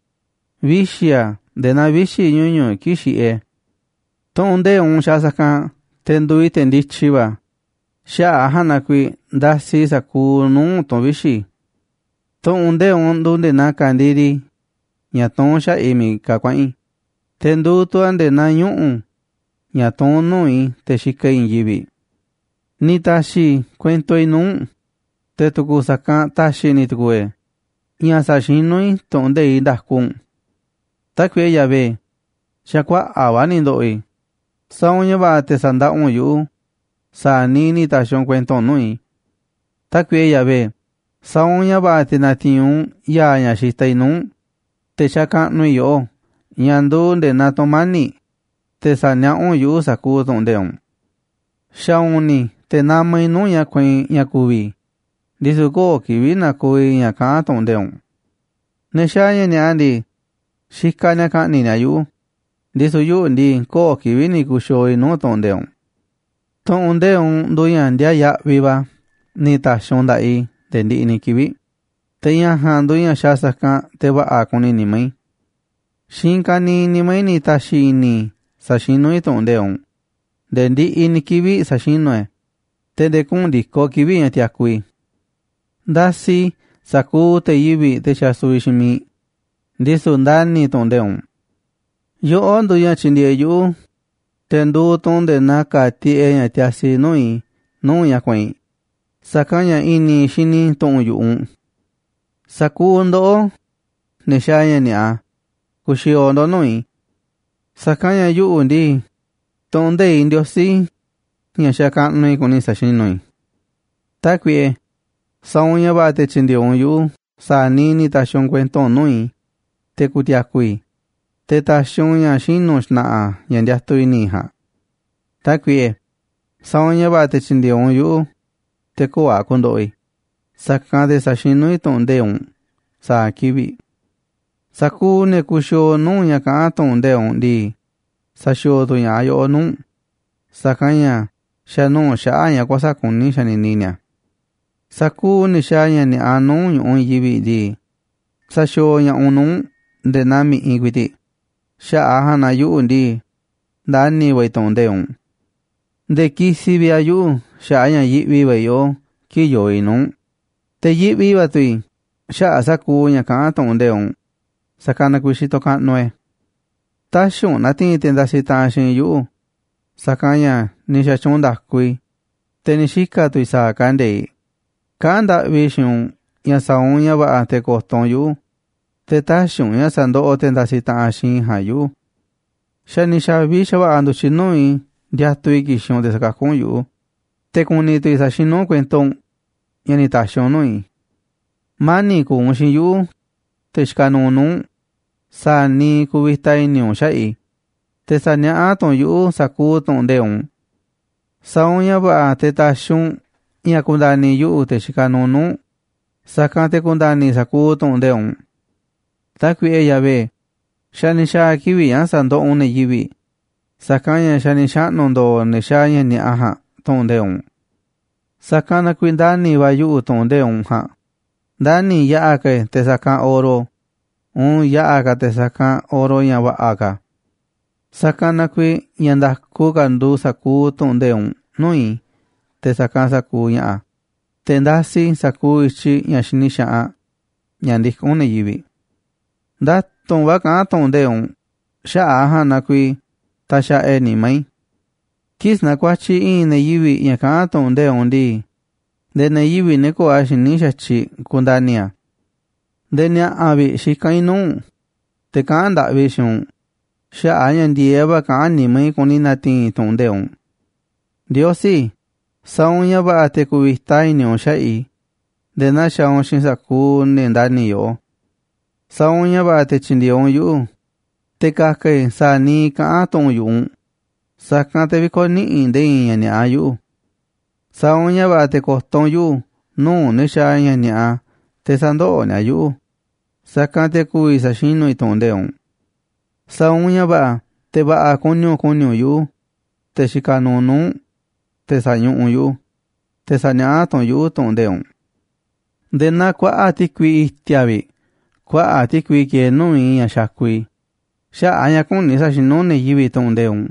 vixi̱ a̱ nde̱e̱ naa vixi̱ ñuñu̱ꞌ kii̱ꞌ xiꞌiꞌ e̱ꞌ. Tu̱ꞌu̱n nde̱iꞌ u̱nꞌ xaaꞌ sa̱kanꞌ te̱ nduuꞌ i̱ te̱ ndityi va̱, xaꞌa̱ꞌ a̱ ja̱a̱nꞌ na kuiiꞌ ndasiꞌ i̱ sa̱kuuꞌ nuu̱ꞌ tu̱n vixi̱. Tu̱ꞌu̱n nde̱iꞌ u̱nꞌ nduuꞌ nde̱e̱ naa ka̱ndiri ña̱ tuún xaꞌa̱ꞌ i̱ miiꞌ ka̱ kuaꞌa̱n i̱, te̱ nduuꞌ tu̱ a̱ nde̱e̱ naa ñuꞌu̱ ña̱ tuún nuu̱ꞌ i̱ te̱ xikaꞌ i̱ i̱i̱n yivi̱ꞌ. Ni̱ ta̱xi̱ i̱ kuento i̱ nuu̱ꞌ u̱nꞌ, te̱ tu̱ku̱ sa̱kanꞌ ta̱xi̱ ni̱ tu̱ku̱u̱ e̱ꞌ ña̱ sa̱xinú i̱ tu̱ꞌu̱n nde̱iꞌ nda̱ku u̱nꞌ. Tákuiꞌe Yahvé, xa̱ kuaꞌa̱ꞌ va̱ ni̱ ndo̱ꞌo̱ i̱, sa̱a̱ u̱nꞌ ña̱ va̱ꞌa̱ te̱ sa̱ndaꞌa u̱nꞌ yuꞌu̱ sa̱a̱ niiꞌ ni̱ ta̱xi̱ u̱nꞌ kuento u̱nꞌ nuu̱ꞌ i̱. Tákuiꞌe Yahvé, sa̱a̱ u̱nꞌ ña̱ va̱ꞌa̱ te̱ na̱ti̱i̱n u̱nꞌ ya̱a̱ ña̱ xitaꞌ i̱ nuu̱ꞌ u̱nꞌ te̱ xakaꞌnuꞌ i̱ yoꞌó, ña̱ nduuꞌ nde̱e̱ naa tu̱mani̱ꞌ, te̱ sa̱niaꞌá u̱nꞌ yuꞌu̱ sa̱kuuꞌ tu̱ꞌu̱n nde̱iꞌ u̱nꞌ. Xa̱u̱u̱n ni̱ te̱ namaꞌ i̱ nuu̱ꞌ ña̱ kueinꞌ ña̱ ku̱vi̱ i̱, ndisu̱ köo̱ꞌ kivi̱ꞌ na̱ko̱o̱ i̱ ña̱ kaꞌán tu̱ꞌu̱n nde̱iꞌ u̱nꞌ. Ne̱ xaaꞌ ña̱ ni̱a̱ꞌa ndii, xikaꞌ ni̱a̱ ka̱ꞌni̱ꞌ ni̱a̱ yuꞌu̱, ndisu̱ yuꞌu̱ ndii, köo̱ꞌ kivi̱ꞌ ni̱ ku̱xi̱o̱o̱ i̱ nuu̱ꞌ tu̱ꞌu̱n nde̱iꞌ u̱nꞌ. Tu̱ꞌu̱n nde̱iꞌ u̱nꞌ nduuꞌ ña̱ ndiaaꞌ yaꞌviꞌ va̱ ni̱ ta̱xi̱ u̱nꞌ nda̱ꞌaꞌ i̱ nde̱e̱ ndiꞌiꞌ ni̱ kivi̱ꞌ, te̱ ña̱ ja̱a̱nꞌ nduuꞌ ña̱ xaaꞌ sa̱kanꞌ te̱ va̱ꞌa̱ kuni nimá i̱. Xiinꞌ i̱i̱n ka̱niiꞌ nimá i̱ ni̱ ta̱xi̱ i̱ni̱ i̱ sa̱xinú i̱ tu̱ꞌu̱n nde̱iꞌ u̱nꞌ, nde̱e̱ ndiꞌiꞌ ni̱ kivi̱ꞌ sa̱xinú i̱ e̱, te̱ nde̱e̱ kuꞌu̱n ndi̱koꞌ kivi̱ꞌ ña̱ tiaku i̱. Ndasiꞌ i̱ sa̱kuuꞌ te̱ yivi̱ꞌ, te̱ xasuviꞌ xiinꞌ miiꞌ, ndisu̱ ndani̱ i̱ tu̱ꞌu̱n nde̱iꞌ u̱nꞌ. Yoꞌó nduuꞌ ña̱ tyindieeꞌ yuꞌu̱, te̱ nduuꞌ tu̱ u̱nꞌ nde̱e̱ naa ka̱a̱ tiꞌeꞌ ña̱ tiasi nuu̱ꞌ i̱ nuu̱ꞌ ña̱ kueinꞌ, sa̱kanꞌ ña̱ i̱ni̱ i̱ xini i̱ tu̱ꞌu̱n yu̱ꞌuꞌ u̱nꞌ. Sa̱kuuꞌ ndoꞌó, ne̱ xaaꞌ ña̱ ni̱a̱ꞌa, ku̱xi̱o̱o̱ ndo̱ꞌ nuu̱ꞌ i̱, sa̱kanꞌ ña̱ yuꞌu̱ ndii, tu̱ꞌu̱n nde̱iꞌ Ndiosí, ña̱ xakaꞌnuꞌ i̱, kuni sa̱xinú i̱. Tákuiꞌe, sa̱a̱ u̱nꞌ ña̱ va̱ꞌa̱ te̱ tyi̱ndi̱e̱eꞌ u̱nꞌ yuꞌu̱ sa̱a̱ niiꞌ ni̱ ta̱xi̱ u̱nꞌ kuento u̱nꞌ nuu̱ꞌ i̱, te̱ ku̱ti̱a̱ku̱ i̱, te̱ ta̱xi̱ u̱nꞌ ña̱ xinu̱ xna̱ꞌa̱ ña̱ ndiatuꞌ i̱ni̱ i̱ ja̱a̱nꞌ. Tákuiꞌe, sa̱a̱ u̱nꞌ ña̱ va̱ꞌa̱ te̱ tyi̱ndi̱e̱eꞌ u̱nꞌ yuꞌu̱, te̱ köo̱ꞌ a̱ ku̱ndo̱ꞌo̱ i̱, sa̱kanꞌ te̱ sa̱xinú i̱ tu̱ꞌu̱n nde̱iꞌ u̱nꞌ sa̱a̱ kivi̱ꞌ. Sa̱kuuꞌ ne̱ kuxiooꞌ nuu̱ꞌ ña̱ kaꞌán tu̱ꞌu̱n nde̱iꞌ u̱nꞌ ndii, saxiooꞌ tu̱ ña̱ꞌaꞌ yoꞌó nuu̱ꞌ u̱nꞌ, sa̱kanꞌ ña̱ xa̱nuu̱ꞌ xaꞌa̱ꞌ ña̱ kuäsa̱ꞌ kuní xanini ni̱a̱. Sa̱kuuꞌ ne̱ xaaꞌ ña̱ ni̱a̱ꞌa nuu̱ꞌ ñu̱ꞌuꞌ i̱i̱n yivi̱ꞌ ndii, saxiooꞌ ña̱ꞌaꞌ u̱nꞌ nuu̱ꞌ u̱nꞌ nde̱e̱ naa mi̱ꞌiꞌ ku̱i̱ti̱ꞌ, xaꞌa̱ꞌ a̱ ja̱a̱nꞌ na yuꞌu̱ ndii, ndani̱ va̱ i̱ tu̱ꞌu̱n nde̱iꞌ u̱nꞌ. Nde̱e̱ kisiꞌ vi̱ꞌ a̱ yuꞌu̱ xaꞌa̱ꞌ a̱ ña̱ yiꞌvi va̱ i̱ yoꞌó kii̱ꞌ yoo i̱ nuu̱ꞌ u̱nꞌ, te̱ yiꞌvi va̱ tu̱ i̱ xaꞌa̱ꞌ sa̱kuuꞌ ña̱ kaꞌán tu̱ꞌu̱n nde̱iꞌ u̱nꞌ, sa̱kanꞌ na kuiiꞌ xitoꞌ kaꞌnuꞌ i̱ e̱. Tä̱xi̱ u̱nꞌ na̱ti̱i̱n te̱ ndasiꞌ taꞌanꞌ xiinꞌ i̱ yuꞌu̱, sa̱kanꞌ ña̱ ni̱ xa̱tyuunꞌ nda̱ku i̱, te̱ ni̱ xika̱ tu̱ i̱ sa̱a̱ kande̱iꞌ. Kaꞌán ndaꞌvi i̱ xiinꞌ u̱nꞌ ña̱ sa̱a̱ u̱nꞌ ña̱ va̱ꞌa̱ te̱ ko̱to̱ u̱nꞌ yuꞌu̱, te̱ tä̱xi̱ u̱nꞌ ña̱ sa̱ndoꞌoꞌ te̱ ndasiꞌ taꞌanꞌ xiinꞌ i̱ ja̱a̱nꞌ yuꞌu̱. Xa̱ ni̱ xa̱vi xa̱va̱ꞌa̱ ndu̱tyiꞌ nuu̱ꞌ i̱ ndiatuꞌ i̱ ki̱xi̱n u̱nꞌ te̱ sa̱kakú u̱nꞌ yuꞌu̱, te̱ ku̱ni̱ tu̱ i̱ sa̱xinú u̱nꞌ kuento u̱nꞌ ña̱ ni̱ ta̱xi̱ u̱nꞌ nuu̱ꞌ i̱. Mani̱ꞌ ku̱u̱ u̱nꞌ xiinꞌ yuꞌu̱, te̱ xikaꞌ nuuꞌ nuu̱ꞌ u̱nꞌ sa̱a̱ niiꞌ kuvita i̱ni̱ u̱nꞌ xaꞌa̱ꞌ i̱, te̱ sa̱niaꞌá tu̱ u̱nꞌ yuꞌu̱ sa̱kuuꞌ tu̱ꞌu̱n nde̱iꞌ u̱nꞌ. Sa̱a̱ u̱nꞌ ña̱ va̱ꞌa̱ te̱ ta̱xi̱ u̱nꞌ ña̱ ku̱nda̱ni̱ yuꞌu̱, te̱ xikaꞌ nuuꞌ u̱nꞌ, sa̱kanꞌ te̱ ku̱nda̱ni̱ i̱ sa̱kuuꞌ tu̱ꞌu̱n nde̱iꞌ u̱nꞌ. Tákuiꞌe Yahvé, xa̱ ni̱ xa̱a̱ kivi̱ꞌ ña̱ sa̱ndoꞌoꞌ u̱nꞌ ne̱ yivi̱ꞌ, sa̱kanꞌ ña̱ xa̱ ni̱ xaꞌnu̱ ndo̱o̱ ne̱ xaaꞌ ña̱ ni̱a̱ꞌa ja̱a̱nꞌ tu̱ꞌu̱n nde̱iꞌ u̱nꞌ. Sa̱kanꞌ na kuiiꞌ ndani̱ va̱ yuꞌu̱ tu̱ꞌu̱n nde̱iꞌ u̱nꞌ ja̱a̱nꞌ, ndani̱ yaꞌa̱ ka̱ i̱ e̱ te̱ sa̱kanꞌ oro uun yaꞌa̱ ka̱ te̱ sa̱kanꞌ oro ña̱ va̱ꞌa̱ ka̱. Sa̱kanꞌ na kuiiꞌ ña̱ nda̱ku ka̱ nduuꞌ sa̱kuuꞌ tu̱ꞌu̱n nde̱iꞌ u̱nꞌ nuu̱ꞌ i̱, te̱ sa̱kanꞌ sa̱kuuꞌ ña̱ꞌa̱, te̱ ndasiꞌ i̱ sa̱kuuꞌ i̱tyiꞌ ña̱ xini xaꞌanꞌ ña̱ ndikún ne̱ yivi̱ꞌ. Nda̱tu̱nꞌ va̱ kaꞌán tu̱ꞌu̱n nde̱iꞌ u̱nꞌ xaꞌa̱ꞌ a̱ ja̱a̱nꞌ na kuiiꞌ taxaꞌa e̱ꞌ e̱ nimá i̱. Kii̱ꞌ sanakuatyiꞌ i̱i̱n ne̱ yivi̱ꞌ ña̱ kaꞌán tu̱ꞌu̱n nde̱iꞌ u̱nꞌ ndii, nde̱e̱ ne̱ yivi̱ꞌ, ne̱ köo̱ꞌ a̱ xiní xa̱tyiꞌ, kundani̱ a̱. Nde̱e̱ ni̱a̱ꞌa̱ vi̱ꞌ xikán i̱ nuu̱ꞌ u̱nꞌ, te̱ kaꞌán ndaꞌvi i̱ xiinꞌ u̱nꞌ, xaꞌa̱ꞌ a̱ ña̱ ndi̱e̱eꞌ va̱ kaꞌán nimá i̱ kuni na̱ti̱i̱n i̱ tu̱ꞌu̱n nde̱iꞌ u̱nꞌ. Ndiosí, sa̱a̱ u̱nꞌ ña̱ va̱ꞌa̱ te̱ ku̱vi̱ta i̱ni̱ u̱nꞌ xaꞌa̱ꞌ i̱ nde̱e̱ naa xaaꞌ u̱nꞌ xiinꞌ sa̱kuuꞌ ne̱ ndani̱ yoꞌó. Sa̱a̱ u̱nꞌ ña̱ va̱ꞌa̱ te̱ tyi̱ndi̱e̱eꞌ u̱nꞌ yuꞌu̱, te̱ ka̱ka̱ i̱ sa̱a̱ niiꞌ kaꞌán tu̱ꞌu̱n yu̱ꞌuꞌ u̱nꞌ, sa̱kanꞌ te̱ vï̱ko̱niꞌiꞌ nde̱e̱ i̱i̱n ña̱ ni̱a̱ꞌa yuꞌu̱. Sa̱a̱ u̱nꞌ ña̱ va̱ꞌa̱ te̱ ko̱to̱ u̱nꞌ yuꞌu̱ nuu̱ꞌ ne̱ xaaꞌ ña̱ ni̱a̱ꞌa te̱ sä̱ndoꞌoꞌ ni̱a̱ yuꞌu̱, sa̱kanꞌ te̱ ku̱vi̱ sa̱xinú i̱ tu̱ꞌu̱n nde̱iꞌ u̱nꞌ. Sa̱a̱ u̱nꞌ ña̱ va̱ꞌa̱ te̱ va̱ꞌa̱ kuni u̱nꞌ ku̱ni̱ u̱nꞌ yuꞌu̱, te̱ xikaꞌ nuuꞌ nuu̱ꞌ u̱nꞌ, te̱ sa̱ñuꞌuꞌ u̱nꞌ yuꞌu̱, te̱ sa̱niaꞌá tu̱ u̱nꞌ yuꞌu̱ tu̱ꞌu̱n nde̱iꞌ u̱nꞌ. Nde̱e̱ naa kuaꞌa̱ꞌ ti̱kui i̱ti̱a̱ vi̱ꞌ kuaꞌa̱ꞌ ti̱kui kieeꞌ nuu̱ꞌ i̱ ña̱ xakuꞌ i̱ xaꞌa̱ꞌ a̱ ña̱ küni sa̱xinú ne̱ yivi̱ꞌ tu̱ꞌu̱n nde̱iꞌ u̱nꞌ.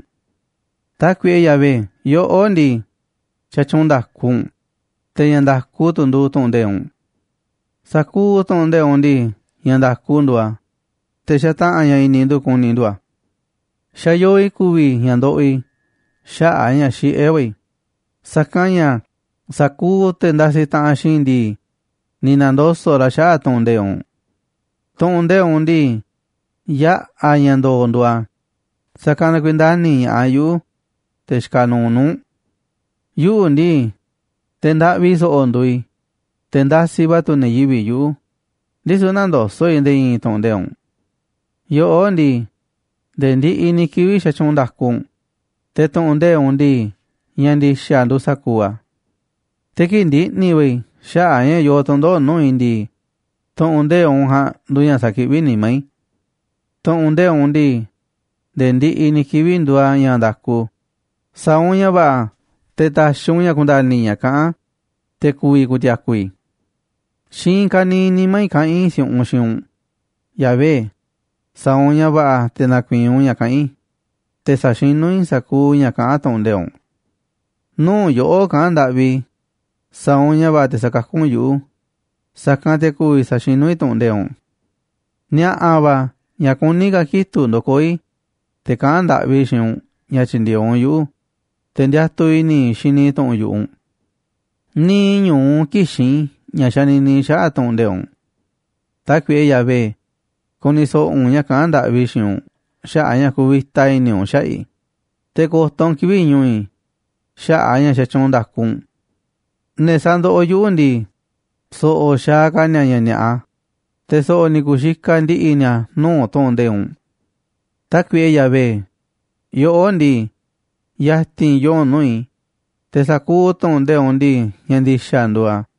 Tákuiꞌe Yahvé, yoꞌó ndii, xatyuunꞌ nda̱ku u̱nꞌ, te̱ ña̱ nda̱ku tu̱ nduuꞌ tu̱ꞌu̱n nde̱iꞌ u̱nꞌ. Sa̱kuuꞌ tu̱ꞌu̱n nde̱iꞌ ndii, ña̱ nda̱ku nduuꞌ a̱, te̱ xataꞌa̱n ña̱ i̱ni̱ ndu̱ ku̱ni̱ ndu̱ a̱. Xa̱ yoo i̱ ku̱vi̱ i̱ ña̱ ndoꞌoꞌ i̱ xaꞌa̱ꞌ a̱ ña̱ xiꞌé va̱ i̱, sa̱kanꞌ ña̱ sa̱kuuꞌ te̱ ndasiꞌ taꞌanꞌ xiinꞌ i̱ ndii, ni̱ na̱ndoso̱ꞌ ra̱ xaꞌa̱ꞌ tu̱ꞌu̱n nde̱iꞌ u̱nꞌ. Tu̱ꞌu̱n nde̱iꞌ u̱nꞌ ndii, yaꞌa̱ ña̱ ndo̱o̱ nduuꞌ a̱, sa̱kanꞌ na kuiiꞌ ndani̱ ña̱ꞌaꞌ yuꞌu̱, te̱ xikaꞌ nuuꞌ nuu̱ꞌ u̱nꞌ. Yuꞌu̱ ndii, te̱ ndaꞌvi so̱ꞌo̱ nduuꞌ i̱, te̱ ndasiꞌ va̱ tu̱ ne̱ yivi̱ꞌ yuꞌu̱, ndisu̱ nändoso̱ꞌ i̱ nde̱e̱ i̱i̱n tu̱ꞌu̱n nde̱iꞌ u̱nꞌ. Yoꞌó ndii, nde̱e̱ ndiꞌiꞌ ni̱ kivi̱ꞌ xatyuunꞌ nda̱ku u̱nꞌ, te̱ tu̱ꞌu̱n nde̱iꞌ u̱nꞌ ndii, ña̱ ndi̱xa̱ nduuꞌ sa̱kuuꞌ a̱. Te̱ kii̱ꞌ ndiꞌni̱ va̱ i̱ xaꞌa̱ꞌ a̱ ña̱ yoo tu̱ndoꞌo̱ꞌ nuu̱ꞌ i̱ ndii, tu̱ꞌu̱n nde̱iꞌ u̱nꞌ ja̱a̱nꞌ nduuꞌ ña̱ sakiꞌví nimá i̱. Tu̱ꞌu̱n nde̱iꞌ u̱nꞌ ndii, nde̱e̱ ndiꞌiꞌ ni̱ kivi̱ꞌ nduuꞌ a̱ ña̱ nda̱ku, sa̱a̱ u̱nꞌ ña̱ va̱ꞌa̱ te̱ ta̱xi̱ u̱nꞌ ña̱ ku̱nda̱ni̱ i̱ ña̱ kaꞌán a̱, te̱ ku̱vi̱ ku̱ti̱a̱ku̱ i̱. Xiinꞌ i̱i̱n ka̱niiꞌ nimá i̱ kaꞌán i̱ si̱u̱ꞌunꞌ xiinꞌ u̱nꞌ, Yahvé, sa̱a̱ u̱nꞌ ña̱ va̱ꞌa̱ te̱ na̱ku̱i̱i̱n u̱nꞌ ña̱ kaꞌán i̱, te̱ sa̱xinú i̱ sa̱kuuꞌ ña̱ kaꞌán tu̱ꞌu̱n nde̱iꞌ u̱nꞌ. Nuu̱ꞌ yoꞌó kaꞌán ndaꞌvi i̱, sa̱a̱ u̱nꞌ ña̱ va̱ꞌa̱ te̱ sa̱kakú u̱nꞌ yuꞌu̱, sa̱kanꞌ te̱ ku̱vi̱ sa̱xinú i̱ tu̱ꞌu̱n nde̱iꞌ u̱nꞌ. Ni̱a̱ꞌa̱ va̱ ña̱ kuní ka̱ kitu̱ꞌ ndokoó i̱, te̱ kaꞌán ndaꞌvi i̱ xiinꞌ u̱nꞌ ña̱ tyi̱ndi̱e̱eꞌ u̱nꞌ yuꞌu̱, te̱ ndiatuꞌ i̱ni̱ i̱ xini tu̱ꞌu̱n yu̱ꞌuꞌ u̱nꞌ. Niiꞌ ñu̱u kïxín i̱ ña̱ xanini i̱ xaꞌa̱ꞌ tu̱ꞌu̱n nde̱iꞌ u̱nꞌ. Tákuiꞌe Yahvé, ku̱ni̱ so̱ꞌo̱ u̱nꞌ ña̱ kaꞌán ndaꞌvi i̱ xiinꞌ u̱nꞌ xaꞌa̱ꞌ a̱ ña̱ kuvita i̱ni̱ u̱nꞌ xaꞌa̱ꞌ i̱, te̱ ko̱to̱ u̱nꞌ kivi̱ꞌ ñu̱u̱ i̱ xaꞌa̱ꞌ a̱ ña̱ xatyuunꞌ nda̱ku u̱nꞌ. Ne̱ sandoꞌoꞌ yuꞌu̱ ndii, so̱ꞌo̱ xaaꞌ ka̱ ni̱a̱ ña̱ ni̱a̱ꞌa, te̱ so̱ꞌo̱ ni̱ ku̱xikaꞌ ndi̱ꞌi̱ ni̱a̱ nuu̱ꞌ tu̱ꞌu̱n nde̱iꞌ u̱nꞌ. Tákuiꞌe Yahvé, yoꞌó ndii, ya̱ti̱n yoo u̱nꞌ nuu̱ꞌ i̱, te̱ sa̱kuuꞌ tu̱ꞌu̱n nde̱iꞌ u̱nꞌ ndii, ña̱ ndi̱xa̱ nduuꞌ a̱.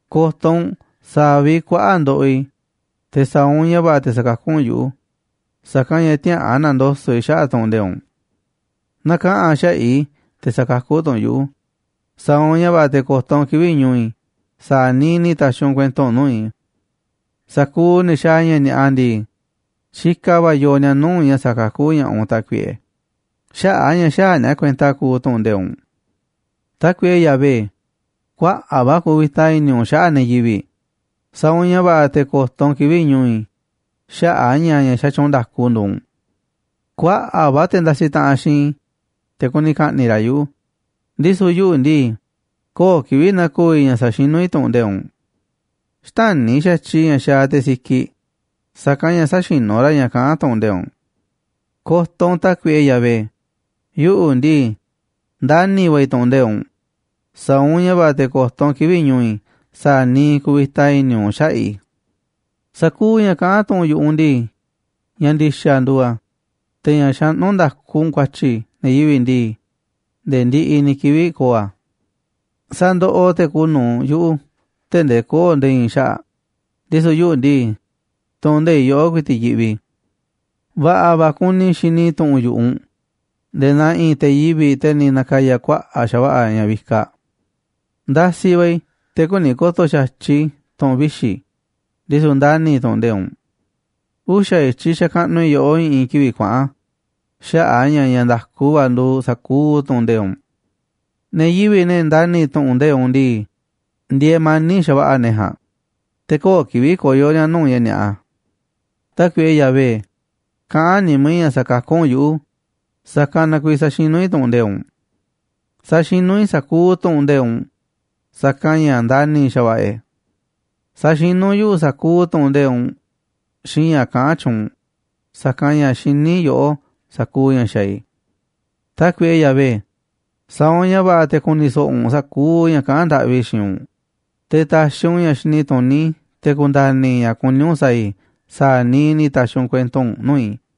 Ko̱to̱ u̱nꞌ sa̱a̱ vi̱ꞌ kuaꞌa̱ꞌ ndoꞌoꞌ i̱, te̱ sa̱a̱ u̱nꞌ ña̱ va̱ꞌa̱ te̱ sa̱kakú u̱nꞌ yuꞌu̱, sa̱kanꞌ ña̱ tïaꞌa̱an na̱ndoso̱ꞌ i̱ xaꞌa̱ꞌ tu̱ꞌu̱n nde̱iꞌ u̱nꞌ. Na̱kaꞌa̱n xaꞌa̱ꞌ i̱, te̱ sa̱kakú tu̱ u̱nꞌ yuꞌu̱, sa̱a̱ u̱nꞌ ña̱ va̱ꞌa̱ te̱ ko̱to̱ u̱nꞌ kivi̱ꞌ ñu̱u̱ i̱ sa̱a̱ niiꞌ ni̱ ta̱xi̱ u̱nꞌ kuento u̱nꞌ nuu̱ꞌ i̱. Sa̱kuuꞌ ne̱ xaaꞌ ña̱ ni̱a̱ꞌa ndii, xikaꞌ va̱ yoo ni̱a̱ nuu̱ꞌ ña̱ sa̱kakú ña̱ꞌaꞌ u̱nꞌ, Tákuiꞌe, xaꞌa̱ꞌ a̱ ña̱ xäaꞌ ni̱a̱ kuenta kuuꞌ tu̱ꞌu̱n nde̱iꞌ u̱nꞌ. Tákuiꞌe Yahvé, kuaꞌa̱ꞌ va̱ kuvita i̱ni̱ u̱nꞌ xaꞌa̱ꞌ ne̱ yivi̱ꞌ, sa̱a̱ u̱nꞌ ña̱ va̱ꞌa̱ te̱ ko̱to̱ u̱nꞌ kivi̱ꞌ ñu̱u̱ i̱ xaꞌa̱ꞌ a̱ ña̱ ña̱ xatyuunꞌ nda̱ku nduuꞌ u̱nꞌ. Kuaꞌa̱ꞌ va̱ te̱ ndasiꞌ taꞌanꞌ xiinꞌ i̱, te̱ kuni ka̱ꞌni̱ꞌ ra̱ yuꞌu̱, ndisu̱ yuꞌu̱ ndii, köo̱ꞌ kivi̱ꞌ na̱ko̱o̱ i̱ ña̱ saxinú i̱ tu̱ꞌu̱n nde̱iꞌ u̱nꞌ. Xtäni̱ xa̱tyiꞌ i̱ ña̱ xaaꞌ te̱ sikiꞌ, sa̱kanꞌ ña̱ säxinú ra̱ ña̱ kaꞌán tu̱ꞌu̱n nde̱iꞌ u̱nꞌ. Ko̱to̱ u̱nꞌ, Tákuiꞌe Yahvé, yuꞌu̱ ndii, ndani̱ va̱ i̱ tu̱ꞌu̱n nde̱iꞌ u̱nꞌ, sa̱a̱ u̱nꞌ ña̱ va̱ꞌa̱ te̱ ko̱to̱ u̱nꞌ kivi̱ꞌ ñu̱u̱ i̱ sa̱a̱ niiꞌ kuvita i̱ni̱ u̱nꞌ xaꞌa̱ꞌ i̱. Sa̱kuuꞌ ña̱ kaꞌán tu̱ꞌu̱n yu̱ꞌuꞌ u̱nꞌ ndii, ña̱ ndi̱xa̱ nduuꞌ a̱, te̱ ña̱ xaꞌnú nda̱ku u̱nꞌ ku̱a̱tyi̱ ne̱ yivi̱ꞌ ndii, nde̱e̱ ndiꞌiꞌ ni̱ kivi̱ꞌ ko̱o̱ a̱. Sandoꞌoꞌ te̱ kuuꞌ nu̱uꞌ yuꞌu̱ tee̱ꞌ ndee köo̱ꞌ nde̱e̱ i̱i̱n xaꞌa̱ꞌ, ndisu̱ yuꞌu̱ ndii, tu̱ꞌu̱n nde̱iꞌ yoꞌó ku̱i̱ti̱ꞌ yiꞌvi i̱. Va̱ꞌa̱ va̱ kuni i̱ xini i̱ tu̱ꞌu̱n yu̱ꞌuꞌ u̱nꞌ, nde̱e̱ naa i̱i̱n te̱ yivi̱ꞌ, te̱ ni̱ na̱ka̱ya̱ kuaꞌa̱ꞌ xa̱va̱ꞌa̱ ña̱ vikaꞌ. Ndasiꞌ va̱ i̱, te̱ küni ko̱to̱ xa̱tyiꞌ i̱ tu̱ꞌu̱n vixi̱, ndisu̱ ndani̱ i̱ tu̱ꞌu̱n nde̱iꞌ u̱nꞌ. Uxa̱ i̱tyiꞌ xakaꞌnuꞌ i̱ yoꞌó i̱ꞌi̱n kivi̱ꞌ kuaꞌa̱n xaꞌa̱ꞌ a̱ ña̱ ña̱ nda̱ku va̱ nduuꞌ sa̱kuuꞌ tu̱ꞌu̱n nde̱iꞌ u̱nꞌ. Ne̱ yivi̱ꞌ, ne̱ ndani̱ tu̱ꞌu̱n nde̱iꞌ u̱nꞌ ndii, ndieeꞌ mani̱ꞌ xa̱va̱ꞌa̱ ne̱ ja̱a̱nꞌ, te̱ köo̱ꞌ kivi̱ꞌ koyo̱ ni̱a̱ nuu̱ꞌ ña̱ ni̱a̱ꞌa. Tákuiꞌe Yahvé, kaꞌán nimá i̱ ña̱ sa̱kakú u̱nꞌ yuꞌu̱, sa̱kanꞌ na kuiiꞌ saxinú i̱ tu̱ꞌu̱n nde̱iꞌ u̱nꞌ. Saxinú i̱ sa̱kuuꞌ tu̱ꞌu̱n nde̱iꞌ u̱nꞌ, sa̱kanꞌ ña̱ ndani̱ xa̱va̱ꞌa̱ e̱. Saxinú yuꞌu̱ sa̱kuuꞌ tu̱ꞌu̱n nde̱iꞌ u̱nꞌ xiinꞌ ña̱ kaꞌán tyuunꞌ u̱nꞌ, sa̱kanꞌ ña̱ xiní yoꞌó sa̱kuuꞌ ña̱ xaaꞌ i̱. Tákuiꞌe Yahvé, sa̱a̱ u̱nꞌ ña̱ va̱ꞌa̱ te̱ ku̱ni̱ so̱ꞌo̱ u̱nꞌ sa̱kuuꞌ ña̱ kaꞌán ndaꞌvi i̱ xiinꞌ u̱nꞌ, te̱ ta̱xi̱ u̱nꞌ ña̱ xini tuní, te̱ ku̱nda̱ni̱ i̱ ña̱ kuní u̱nꞌ sa̱a̱ i̱ sa̱a̱ niiꞌ ni̱ ta̱xi̱ u̱nꞌ kuento u̱nꞌ nuu̱ꞌ i̱.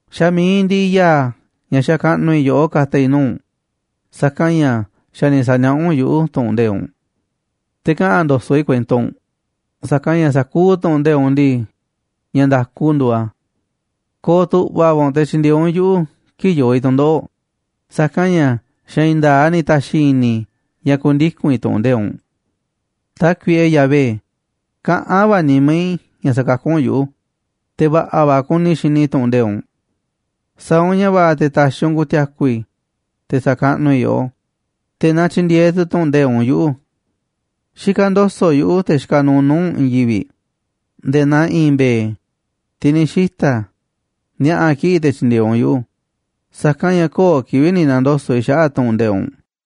Xa̱ mi̱iꞌ ndiꞌiꞌ ya̱a̱ ña̱ xakaꞌnuꞌ i̱ yoꞌó ka̱ta̱ i̱ nuu̱ꞌ u̱nꞌ, sa̱kanꞌ ña̱ xa̱ ni̱ sa̱niaꞌá u̱nꞌ yuꞌu̱ tu̱ꞌu̱n nde̱iꞌ u̱nꞌ. Te̱ kaꞌa̱n ndo̱so̱ꞌ i̱ kuento u̱nꞌ, sa̱kanꞌ ña̱ sa̱kuuꞌ tu̱ꞌu̱n nde̱iꞌ u̱nꞌ ndii, ña̱ nda̱ku nduuꞌ a̱. Ko̱o̱ tu̱ꞌva̱ va̱ u̱nꞌ te̱ tyi̱ndi̱e̱eꞌ u̱nꞌ yuꞌu̱ kii̱ꞌ yoo i̱ tu̱ndoꞌo̱ꞌ, sa̱kanꞌ ña̱ xa̱ i̱i̱n nda̱a̱ꞌ a̱ ni̱ ta̱xi̱ i̱ni̱ i̱ ña̱ ku̱ndiku̱n i̱ tu̱ꞌu̱n nde̱iꞌ u̱nꞌ. Tákuiꞌe Yahvé, kaꞌán va̱ nimá i̱ ña̱ sa̱kakú u̱nꞌ yuꞌu̱, te̱ va̱ꞌa̱ va̱ kuni i̱ xini i̱ tu̱ꞌu̱n nde̱iꞌ u̱nꞌ. Sa̱a̱ u̱nꞌ ña̱ va̱ꞌa̱ te̱ ta̱xi̱ u̱nꞌ ku̱ti̱a̱ku̱ i̱, te̱ sa̱kaꞌnuꞌ i̱ yoꞌó, te̱ na tyi̱ndi̱e̱eꞌ tu̱ tu̱ꞌu̱n nde̱iꞌ u̱nꞌ yuꞌu̱. Xikaꞌ ndo̱so̱ꞌ yuꞌu̱, te̱ xikaꞌ nuuꞌ nuu̱ꞌ u̱nꞌ, i̱i̱n yivi̱ꞌ nde̱e̱ naa i̱i̱n mbe̱e̱, tiꞌ ni̱ xita̱, ni̱a̱ꞌa̱ kiꞌi̱ꞌ te̱ tyi̱ndi̱e̱eꞌ u̱nꞌ yuꞌu̱, sa̱kanꞌ ña̱ köo̱ꞌ kivi̱ꞌ ni̱ na̱ndoso̱ꞌ i̱ xaꞌa̱ꞌ tu̱ꞌu̱n nde̱iꞌ u̱nꞌ.